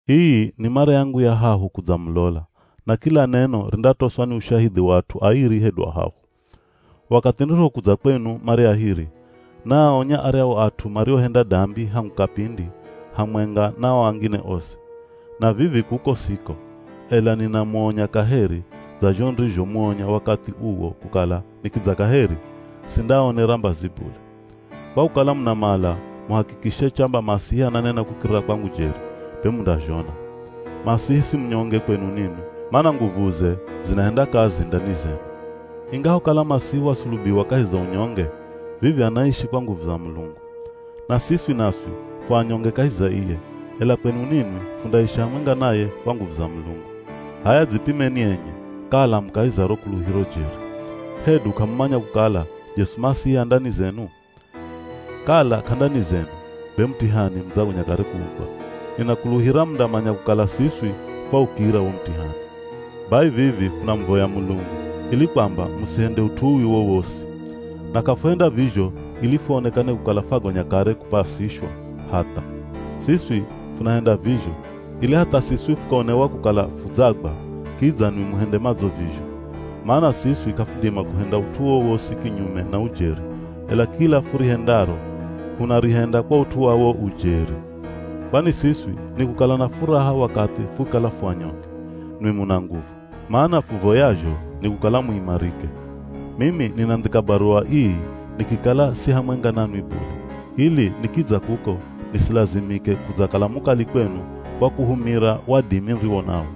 Ii ni mara yangu ya hahu kudzamulola, na kila neno rindatoswa ni ushahidhi wa at'u airi hedu ahahu. Wakathi nirihokudza kwenu mara ya hiri, naaonya aryahu at'u mariohenda dambi hangu kapindi hamwenga na o angine osi. Na vivi kuko siko, ela ninamuonya kaheri dza zho nirizhomuonya wakathi uwo kukala nikidza kaheri, sindaaonera mbazi bule. Kwa kukala munamala muhakikishe chamba Masihi ananena kukirira kwangu jeri, be mundazhona. Masihi si munyonge kwenu ninwi, mana nguvuze zinahenda kazi ndani zenu. Ingahokala Masihi wasulubiwa kahi za unyonge, vivi anaishi kwa nguvu za Mulungu. Na siswi naswi fu anyonge kahi za iye, ela kwenu ninwi fundaishi hamwenga naye kwa nguvu za Mulungu. H'aya dzipimeni enye kala mu kahi za ro kuluhiro jeri. Hedu k'amumanya kukala Jesu Masihi a ndani zenu? Kala k'a ndani zenu be mutihani mudzagonya kare kuugwa. Ninakuluhira mundamanya kukala siswi fwaukira wo mutihani. Bai vivi funamuvoya Mulungu ili kwamba musihende ut'u uwi wowosi. Na k'afuhenda vizho ili fuonekane kukala fwagonya kare kupasishwa, hatha. Siswi funahenda vizho ili hatha siswi fukaonewa kukala fudzagwa kidza nwi muhende madzo vizho. Mana siswi k'afudima kuhenda ut'u wowosi kinyume na ujeri, ela kila furihendaro hunarihenda kwa ut'u wa wo ujeri. Kwani siswi nikukala na furaha wakathi fukikala fu anyonge, nwi muna nguvu. Mana fuvoyazho ni kukala muimarike. Mimi ninandhika baruwa ii nikikala si hamwenga nanwi bule, ili nikidza kuko nisilazimike kudzakala mukali kwenu kwa kuhumira wadimi niriwo nawo.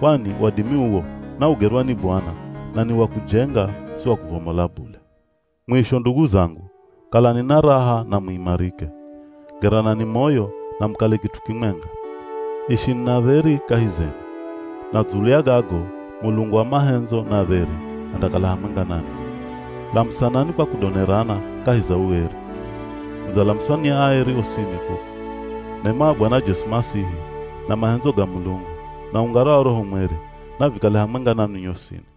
Kwani wadimi uwo naugerwa ni Bwana na ni wa kujenga si wa kuvomola bule. Mwisho ndugu zangu, kalani na raha na muimarike. Geranani moyo na mukale kit'u kimwenga. Ishini na dheri kahi zenu. Na dzulu ya gago Mulungu wa mahendzo na dheri andakala hamwenga nanwi. Lamusanani kwa kudonerana kahi za ueri. Mudzalamuswa ni aeri osini kuku. Nema ya Bwana Jesu Masihi, na mahendzo ga Mulungu, na ungara wa Roho Mweri; navikale hamwenga nanwi nyosini.